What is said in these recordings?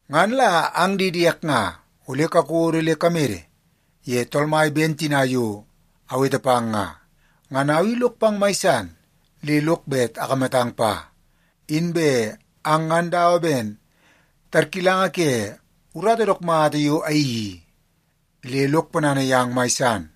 Ngan la ang di diek nga, ole kakodo le kamede ye Tool Mai ben tina yo awete pang nga. Ngan au i lok pang mai san le lok bet akamatang pa. Inbe ang ngan dawa ben tarkilanga ke urata dook mata yo ayeii i, le lok ponana yang mai san.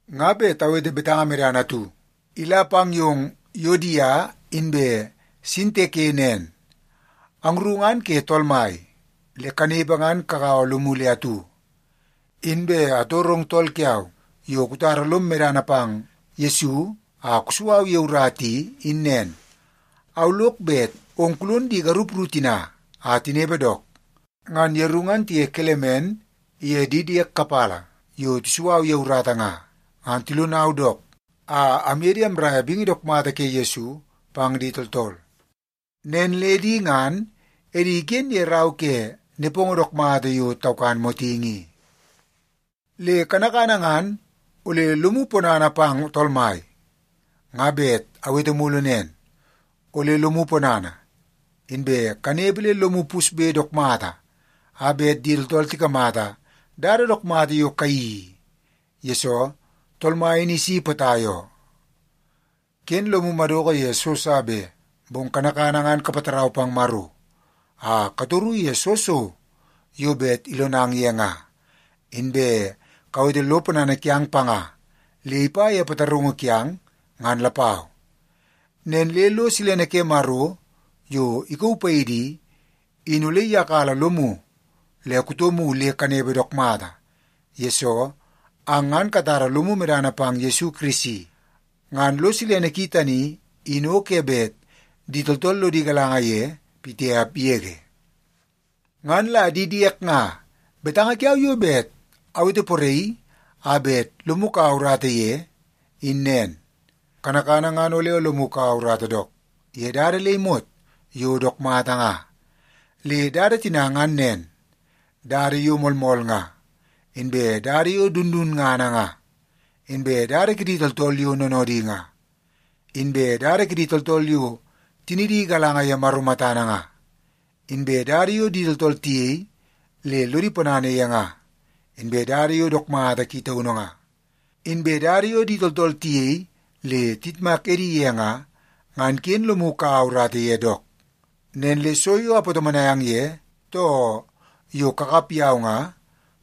Nga bet awete betanga medana atu ila pang yong Yuodia inbe Sintike nen. Angru ngan ke Tool Mai, le kanepe ngan kagaua lomu le atu. Inbe atorong tool kiau yo kutara lom medana pang Yesu a kusu au ye urata i, in nen. Au lok bet ong kulon di garup ru tina a tinepe dook. Ngan yeru ngan tiye Kelemen iye di diek kapala yo tisu au ye urata nga, ngan tilonau dook a amye di amraia bingi dook mata ke Yesu pang di tooltool. Nen le di ngan edi iken ye rau ke nepongo dook mata yo taukan motingi i. Le kanakana ngan ole lomu ponana pang Tool Mai. Nga bet awete mulu nen, ole lomu ponana! Inbe kanepe le lomu pusbe dook mata a bet di tooltool tikamata dada dook mata yo kayeii i, yesoo Tool Mai in isi potai oo. Ken lomu madoko ye so sa be, bong kanakana ngan kapatarau pang Maro a katoru ye soo so yo bet ilonang ye nga. Inbe kawete lo ponana kiang panga le ipa ye pataraungu kiang ngan lapau. Nen le lo silene ke Maro yo ikauu paidi i, in ole iyakala lomu le kutomu le kanepe dook mata, yesoo ang ngan katara lomu medana pang Yesu Kirisi. Ngan lo silene ki tani, in o ke bet di tooltool lodi galanga ye pitiap yege. Ngan la di diek nga, betanga kiau yo bet awete poraii a bet lomu kaua urata ye, in nen. Kanakana ngan ole lomu kaua urata dook ye dada le imot yo dook mata nga. Le dada tina ngan nen: dada yo moolmool nga, inbe dada yo dundunngana nga, inbe dada kidi tooltool yo noonoodi nga, inbe dada kidi tooltool yo tinidi igalanga ye Maro matana nga, inbe dada yo di tooltool tiyei le lodo ponana ye nga, inbe dada yo dook mata ki taunu nga, inbe dada yo di tooltool tiyei le tayitmak edi ye nga, ngan ken lomu kaua urata ye dook. Nen le so yo apatomonai ang ye, too yo kakap yau nga,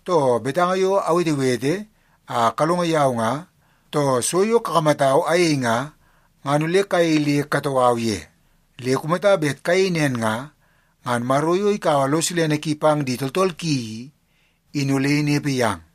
too betanga yo awetewete a kalongo yau nga, too so yo kakamatau ayei nga, ngan ole kayei le katoo au ye. Le kumata bet kayei nen nga, ngan Maro yo ikaua lo silene ki pang di tooltool ki i, in ole inepe yang.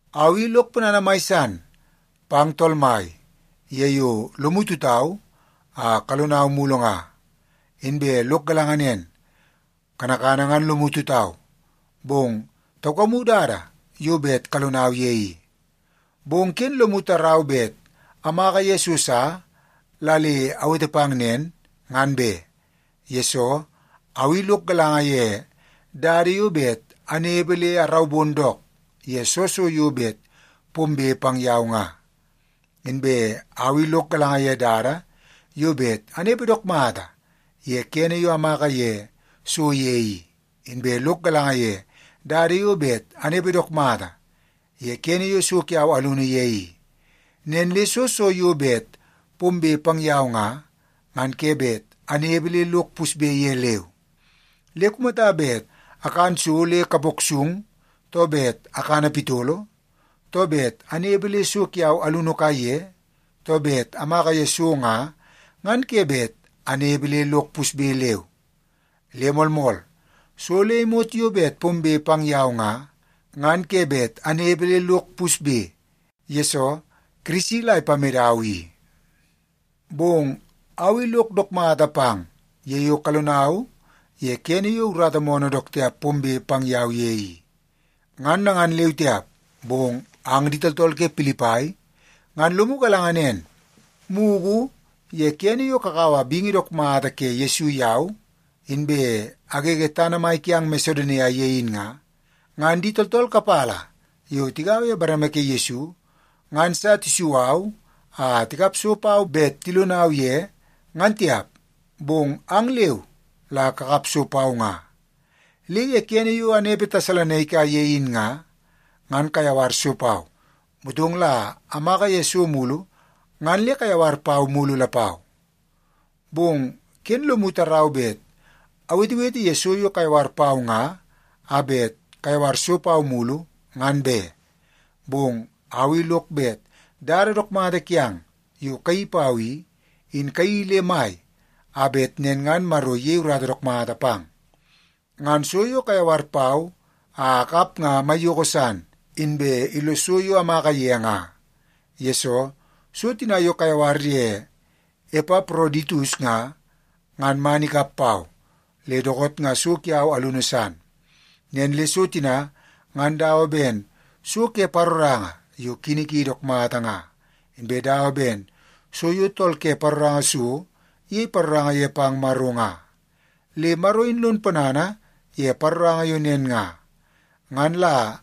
Au i lok ponana mai san pang Tool Mai ye yo lomu tutau a kalonau mulu nga. Inbe lok galanga nen, kanakana ngan lomu tutau, bong taukamu dada yo bet kalonau ye i. Bong ken lomu tarau bet amaka ye so sa la le awete pang nen, ngan be. Yesoo, au i lok galanga ye dada yo bet anepe le araubon dook ye soo so yo bet pombe pang yau nga. Inbe au i lok galanga ye dada yo bet anepe dook mata ye kene yo amaka ye so ye i, inbe lok galanga ye dada yo bet anepe dook mata ye kene yo so kiau alunu ye i. Nen le soo so yo bet pombe pang yau nga, ngan ke bet anepe le lok pusbe ye leu. Le kumata bet akan so le kapok sung, too bet akana pitolo, too bet anepe le so kiau alunu kaiye, too bet amaka ye so nga, ngan ke bet anepe le lok pusbe leu. Le moolmool, so le imot yo bet pombe pang yau nga, ngan ke bet anepe le lok pusbe, yesoo Kirisi la ipamedau i. Bong au i lok dook mata pang ye yo kalonau ye kene yo urata moonoo dook tiap pombe pang yau ye i. Ngan nangan leu tiap, bong ang di tooltool ke Pilipai ngan lomu galanga nen, mugu ye kene yo kakaua bingi dook mata ke Yesu yau, inbe agege tana mai kiang Masedonia ye in nga, ngan di tooltool kapala yo tigaua ye bareme ke Yesu ngan sa tisu au a tikap so pau bet tilonau ye, ngan tiap. Bong ang leu la kakap so pau nga. Le ye kene yo anepe Tesalonaika ye in nga, ngan kayawar so pau. Motong la amaka ye so mulu ngan le kayawar pau mulu lapau. Bong ken lomu tarau bet awetewete ye so yo kayawar pau nga a bet kayawar so pau mulu, ngan be. Bong au i lok bet dada dook mata kiang yo kayeii pau i, in kayeii le mai a bet nen ngan Maro iyei urata dook mata pang. Ngan so yo kayawar pau a akap nga maiyoko san, inbe illos so yo amaka ye nga. Yesoo, so tina yo kayawar ye Epaproditus nga, ngan man ikap pau, le dookoot nga so kiau alunu san. Nen le so tina ngan dawa ben so ke paroranga yo kini ki dook mata nga, inbe dawa ben so yo tool ke paroranga so iyei paroranga ye pang Maro nga. Le Maro in lon ponana ye paroranga yo nen nga. Ngan la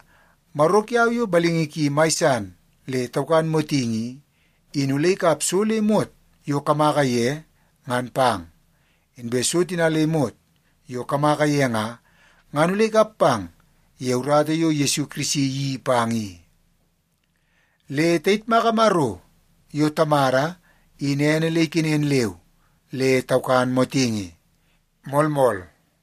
Maro kiau yo balingi ki mai san le taukan motingi i, in ole ikap so le imot yo kamaka ye ngan pang. Inbe so tina le imot yo kamaka ye nga, ngan ole ikap pang ye urata yo Yesu Kirisi iyeii pang i. Le tayitmaka Maro yo Tamada in ene le ikenen leu le taukan motingi. Moolmool.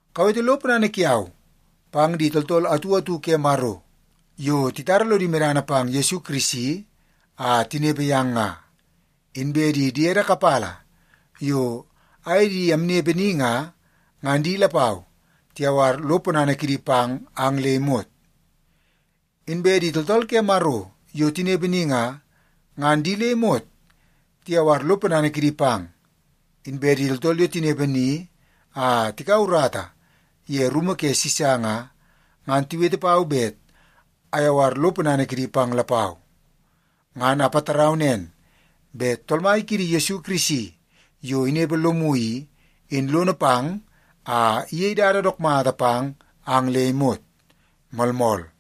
Kawete lo ponana kiau pang di tooltool atu atu ke Maro yo titara lodi medana pang Yesu Kirisi a tinepe yang nga. Inbe di diede kapala yo aye di amnepe ni nga, ngan di lapau tiyawar lo ponana kidi pang ang le imot. Inbe di tooltool ke Maro yo tinepe ni nga, ngan di le imot tiyawar lo ponana kidi pang. Inbe di tooltool yo tinepe ni a tikaua urata ye rumu ke Sisa nga, ngan tiwete pau bet ayawar lo ponana kidi pang lapau. Ngan apatarau nen bet Tool Mai kiidi Yesu Kirisi yo inepe lomu i, in lono pang a iyei dada dook mata pang ang le imot. Moolmool.